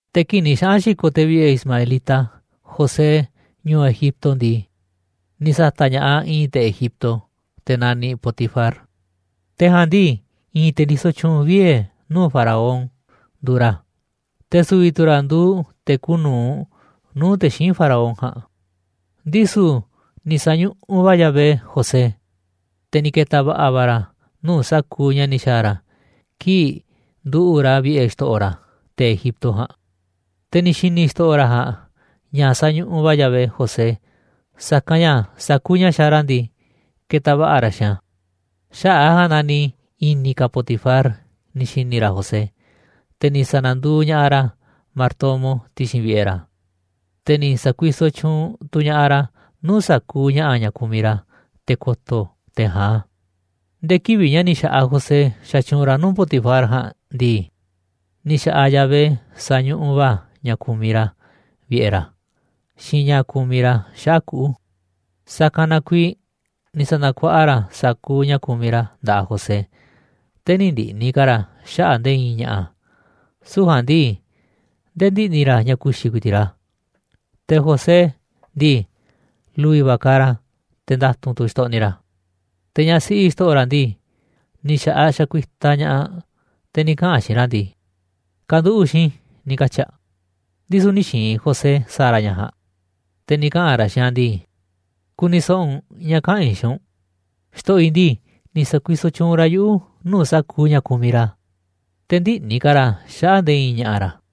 Te̱ kii̱ꞌ ni̱ xaꞌa̱n xi̱ko̱ te̱ vi̱ꞌe̱ ismaelita José ñu̱u̱ Egipto ndii, ni̱ sa̱ta̱ꞌ ña̱ꞌaꞌ i̱i̱n te̱ Egipto, te̱ naniꞌ Potifar, te̱ ja̱a̱nꞌ ndii, i̱i̱n te̱ ndisoꞌ tyuunꞌ vie̱ nuu̱ꞌ Faraón nduuꞌ ra̱, te̱ su̱vi̱ tu̱ ra̱ nduuꞌ te̱ kuuꞌ nu̱uꞌ nuu̱ꞌ te̱ xíinꞌ Faraón ja̱a̱nꞌ. Ndisu̱ ni̱ sa̱ñuꞌuꞌ va̱ Yahvé José, te̱ ni̱ ke̱ta̱ va̱ꞌa̱ va̱ ra̱ nuu̱ꞌ sa̱kuuꞌ ña̱ ni̱ xa̱a̱ ra̱ kii̱ꞌ nduꞌu̱ꞌ ra̱ vi̱ꞌe̱ xto̱ꞌo̱ ra̱, te̱ Egipto ja̱a̱nꞌ. Te̱ ni̱ xi̱ni̱ xto̱ꞌo̱ ra̱ ja̱a̱nꞌ ña̱ sañuꞌuꞌ va̱ Yahvé José, sa̱kanꞌ ña̱ sa̱kuuꞌ ña̱ xaaꞌ ra̱ ndii, ketaꞌ va̱ꞌa̱ ra̱ xiinꞌ a̱. Xaꞌa̱ꞌ a̱ ja̱a̱nꞌ na ni̱ i̱ni̱ ka̱ Potifar ni̱ xi̱ni̱ ra̱ José, te̱ ni̱ sa̱na̱nduuꞌ ña̱ꞌaꞌ ra̱ martomo ti̱xi̱n vi̱ꞌe̱ ra̱, te̱ ni̱ sa̱kuisoꞌ tyuunꞌ tu̱ ña̱ꞌaꞌ ra̱ nuu̱ꞌ sa̱kuuꞌ ña̱ꞌa̱ ña̱ kumiꞌ ra̱, te̱ ko̱to̱ te̱ ja̱a̱nꞌ a̱. Nde̱e̱ kivi̱ꞌ ña̱ ni̱ xa̱ꞌaꞌ José xatyuunꞌ ra̱ nuu̱ꞌ Potifar ja̱a̱nꞌ ndii, ni̱ xa̱ꞌaꞌ Yahvé sañuꞌuꞌ va̱ a̱ ña̱ kumiꞌ ra̱ vi̱ꞌe̱ ra̱, xiinꞌ ña̱ kumiꞌ ra̱ xaꞌa̱ꞌ kuꞌu̱. Sa̱kanꞌ na kuiiꞌ ni̱ sa̱na̱kuaꞌa ra̱ sa̱kuuꞌ ña̱ kumiꞌ ra̱ nda̱ꞌaꞌ José, te̱ nï̱ ndi̱ꞌni̱ ka̱ ra̱ xaꞌa̱ꞌ nde̱e̱ i̱i̱n ña̱ꞌa̱, süu̱ꞌ ja̱a̱nꞌ ndii, ndee ndiꞌni̱ ra̱ ña̱ ku̱xi̱ ku̱i̱ti̱ꞌ ra̱. Te̱ José ndii, lu̱vi̱ va̱ kaaꞌ ra̱, te̱ nda̱tu̱nꞌ tu̱ xtoꞌniꞌ ra̱. Te̱ ñaꞌ siꞌi xto̱ꞌo̱ ra̱ ndii, ni̱ xa̱ꞌaꞌ xakuiꞌtaꞌ ña̱ꞌaꞌ aꞌ, te̱ ni̱ kaꞌa̱n aꞌ xiinꞌ ra̱ ndii: ―Ka̱nduꞌu̱ꞌ xiinꞌ i̱ ―ni̱ katyi̱ aꞌ. Ndisu̱ nï̱ xi̱i̱n José sa̱a̱ ra̱ ña̱ ja̱a̱nꞌ, te̱ ni̱ kaꞌa̱n ra̱ xiinꞌ aꞌ ndii: ―Ku̱ni̱ so̱ꞌo̱ u̱nꞌ ña̱ kaꞌa̱n i̱ xiinꞌ u̱nꞌ. Xto̱ꞌo̱ i̱ ndii, ni̱ sa̱kuisoꞌ tyuunꞌ ra̱ yuꞌu̱ nuu̱ꞌ sa̱kuuꞌ ña̱ kumiꞌ ra̱, te̱ ndïꞌni̱ ka̱ ra̱ xaꞌa̱ꞌ nde̱e̱ i̱i̱n ña̱ꞌa̱ ra̱.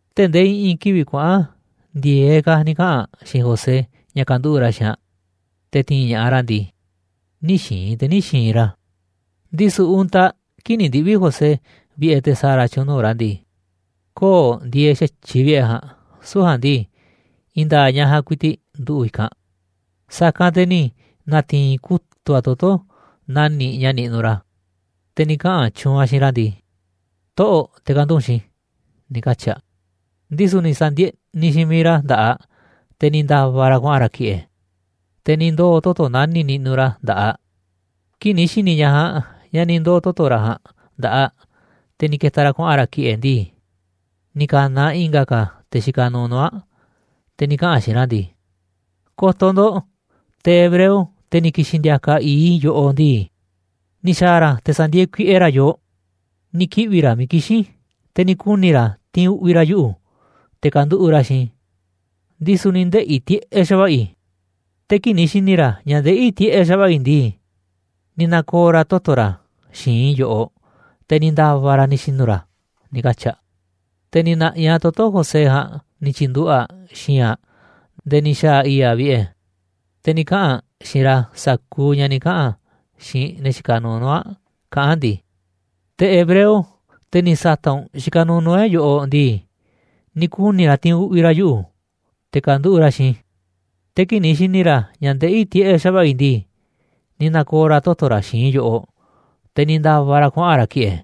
Tee̱ꞌ ndee i̱ꞌi̱n kivi̱ꞌ kuaꞌa̱n ndi̱e̱eꞌ ka̱ ni̱ kaꞌa̱n aꞌ xiinꞌ José ña̱ ka̱nduꞌu̱ꞌ ra̱ xiinꞌ aꞌ, te̱ ti̱i̱n ña̱ꞌaꞌ ra̱ ndii, nï̱ xi̱i̱n te̱ nï̱ xi̱i̱n ra̱. Ndisu̱ untaꞌ kii̱ꞌ ni̱ ndiꞌvi̱ José vi̱ꞌe̱ te̱ sa̱a̱ ra̱ tyu̱u̱n nuu̱ꞌ ra̱ ndii, köo̱ꞌ ndieeꞌ xa̱tyiꞌ vi̱ꞌe̱ ja̱a̱nꞌ, süu̱ꞌ ja̱a̱nꞌ ndii, i̱i̱n nda̱a̱ꞌ ñaꞌ ja̱a̱nꞌ ku̱i̱ti̱ꞌ nduꞌu̱ꞌ i̱kanꞌ. Sa̱kanꞌ te̱ ni̱ na̱ti̱i̱n kutu̱ꞌ aꞌ toto̱ nani̱ꞌ ña̱ niꞌnuꞌ ra̱, te̱ ni̱ kaꞌa̱n tyuunꞌ aꞌ xiinꞌ ra̱ ndii: ―Toꞌo̱ꞌ, te̱ ka̱nduꞌu̱ꞌ u̱nꞌ xiinꞌ i̱ ―ni̱ katyi̱ aꞌ. Ndisu̱ ni̱ sa̱ndieꞌniꞌ xiinꞌ miiꞌ ra̱ nda̱ꞌaꞌ aꞌ, te̱ ni̱ nda̱va̱ ra̱ kuaꞌa̱n ra̱ ki̱ꞌe̱, te̱ ni̱ ndoo̱ toto̱ nani̱ꞌ niꞌnuꞌ ra̱ nda̱ꞌaꞌ aꞌ. Kii̱ꞌ ni̱ xi̱ni̱ ñaꞌ ja̱a̱nꞌ ña̱ ni̱ ndoo̱ toto̱ ra̱ ja̱a̱nꞌ nda̱ꞌaꞌ aꞌ, te̱ ni̱ ke̱ta̱ ra̱ kuaꞌa̱n ra̱ ki̱ꞌe̱ ndii, ni̱ ka̱na̱ aꞌ i̱nga̱ ka̱ te̱ xikaꞌ nuuꞌ nuu̱ꞌ aꞌ, te̱ ni̱ kaꞌa̱n aꞌ xiinꞌ ra̱ ndii: ―Ko̱to̱ ndo̱ꞌ, te̱ hebreo, te̱ ni̱ ki̱xi̱n ndi̱a̱ka̱ i̱i̱ꞌ i̱ yoꞌoꞌ ndii, ni̱ xa̱a̱ ra̱ te̱ sa̱ndi̱e̱e̱ kuiꞌe ra̱ yoo. Ni̱ kiꞌvi̱ ra̱ miiꞌ kixín i̱, te̱ ni̱ kuni̱ ra̱ ti̱i̱n uꞌvi̱ ra̱ yuꞌu̱ te̱ ka̱nduꞌu̱ꞌ ra̱ xiinꞌ i̱, ndisu̱ ni̱ ndeꞌi̱ tiꞌeꞌ xa̱va̱ꞌa̱ i̱. Te̱ kii̱ꞌ ni̱ xi̱ni̱ ra̱ ña̱ ndeꞌí tiꞌeꞌ xa̱va̱ꞌa̱ i̱ ndii, ni̱ na̱ko̱o̱ ra̱ toto̱ ra̱ xi̱i̱nꞌ i̱ yoꞌoꞌ, te̱ ni̱ nda̱va̱ ra̱ ni̱ xi̱nu̱ ra̱ ―ni̱ katyi̱ aꞌ. Te̱ ni̱ na̱ꞌi̱ aꞌ toto̱ José ja̱a̱nꞌ ni̱ tyi̱nduꞌu̱ꞌ aꞌ xi̱i̱nꞌ aꞌ nde̱e̱ ni̱ xa̱a̱ i̱i̱ꞌ aꞌ vi̱ꞌe̱. Te̱ ni̱ kaꞌa̱n aꞌ xiinꞌ ra̱ sa̱kuuꞌ ña̱ ni̱ kaꞌa̱n aꞌ xiinꞌ ne̱ xikaꞌ nuuꞌ nuu̱ꞌ aꞌ, kaꞌán aꞌ ndii: ―Te̱ hebreo, te̱ ni̱ sa̱ta̱ꞌ u̱nꞌ xikaꞌ nuuꞌ nuu̱ꞌ e̱ꞌ yoꞌoꞌ ndii, ni̱ kuni̱ ra̱ ti̱i̱n uꞌvi̱ ra̱ yuꞌu̱, te̱ ka̱nduꞌu̱ꞌ ra̱ xiinꞌ i̱, te̱ kii̱ꞌ ni̱ xi̱ni̱ ra̱ ña̱ ndeꞌí tiꞌeꞌ xa̱va̱ꞌa̱ i̱ ndii, ni̱ na̱ko̱o̱ ra̱ toto̱ ra̱ xi̱i̱nꞌ i̱ yoꞌoꞌ, te̱ ni̱ nda̱va̱ ra̱ kuaꞌa̱n ra̱ ki̱ꞌe̱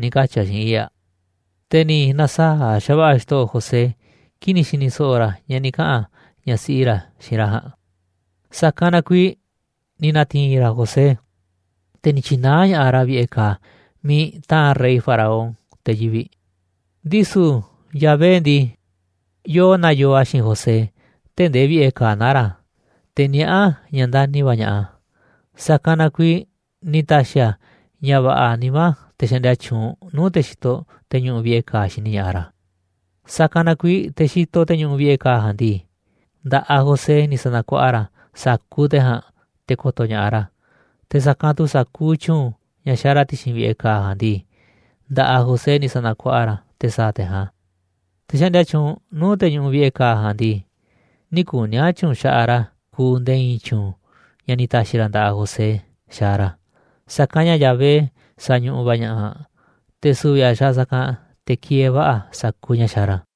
―ni̱ katyi̱ aꞌ xiinꞌ i̱i̱ꞌ aꞌ. Te̱ ni̱ na̱saa̱ꞌ xa̱va̱ꞌa̱ xto̱ꞌo̱ José kii̱ꞌ ni̱ xi̱ni̱ so̱ꞌo̱ ra̱ ña̱ ni̱ kaꞌa̱n ñaꞌ siꞌi ra̱ xiinꞌ ra̱ ja̱a̱nꞌ, sa̱kanꞌ na kuiiꞌ ni̱ na̱ti̱i̱n ra̱ José, te̱ ni̱ tyi̱naá ña̱ꞌaꞌ ra̱ vi̱ꞌe̱ ka̱a̱ miiꞌ taa̱nꞌ rey Faraón te̱ yivi̱ꞌ. Ndisu̱ Yahvé ndii, yoo naa yoo a̱ xiinꞌ José tee̱ꞌ ndee vi̱ꞌe̱ ka̱a̱ naá ra̱, te̱ niaꞌá a̱ ña̱ ndani̱ va̱ ña̱ꞌaꞌ a̱, sa̱kanꞌ na kuiiꞌ ni̱ ta̱xi̱ a̱ ña̱ va̱ꞌa̱ nimá te̱ xaꞌndia tyuunꞌ nuu̱ꞌ te̱ xitoꞌ te̱ ñuꞌuꞌ vi̱ꞌe̱ ka̱a̱ xini ña̱ꞌaꞌ ra̱. Sa̱kanꞌ na kuiiꞌ te̱ xitoꞌ te̱ ñuꞌuꞌ vi̱ꞌe̱ ka̱a̱ ja̱a̱nꞌ ndii, nda̱ꞌaꞌ José ni̱ sa̱na̱kuaꞌa ra̱ sa̱kuuꞌ te̱ ja̱a̱nꞌ te̱ ko̱to̱ ña̱ꞌaꞌ ra̱, te̱ sa̱kanꞌ tu̱ sa̱kuuꞌ tyu̱u̱n ña̱ xaaꞌ ra̱ ti̱xi̱n vi̱ꞌe̱ ka̱a̱ ja̱a̱nꞌ ndii, nda̱ꞌaꞌ José ni̱ sa̱na̱kuaꞌa ra̱ te̱ sa̱a̱ te̱ ja̱a̱nꞌ a̱. Te̱ xaꞌndia tyuunꞌ nuu̱ꞌ te̱ ñuꞌuꞌ vi̱ꞌe̱ ka̱a̱ ja̱a̱nꞌ ndii, nï̱ kuni̱ a̱ tyu̱u̱n xaꞌaꞌ ra̱ kuuꞌ nde̱e̱ i̱i̱n tyu̱u̱n ña̱ ni̱ ta̱xi̱ ra̱ nda̱ꞌaꞌ José xaaꞌ ra̱, sa̱kanꞌ ña̱ Yahvé sañuꞌuꞌ va̱ ña̱ꞌaꞌ, te̱ su̱vi̱ a̱ xa̱a̱ sa̱kanꞌ te̱ kieeꞌ va̱ꞌa̱ sa̱kuuꞌ ña̱ xaaꞌ ra̱.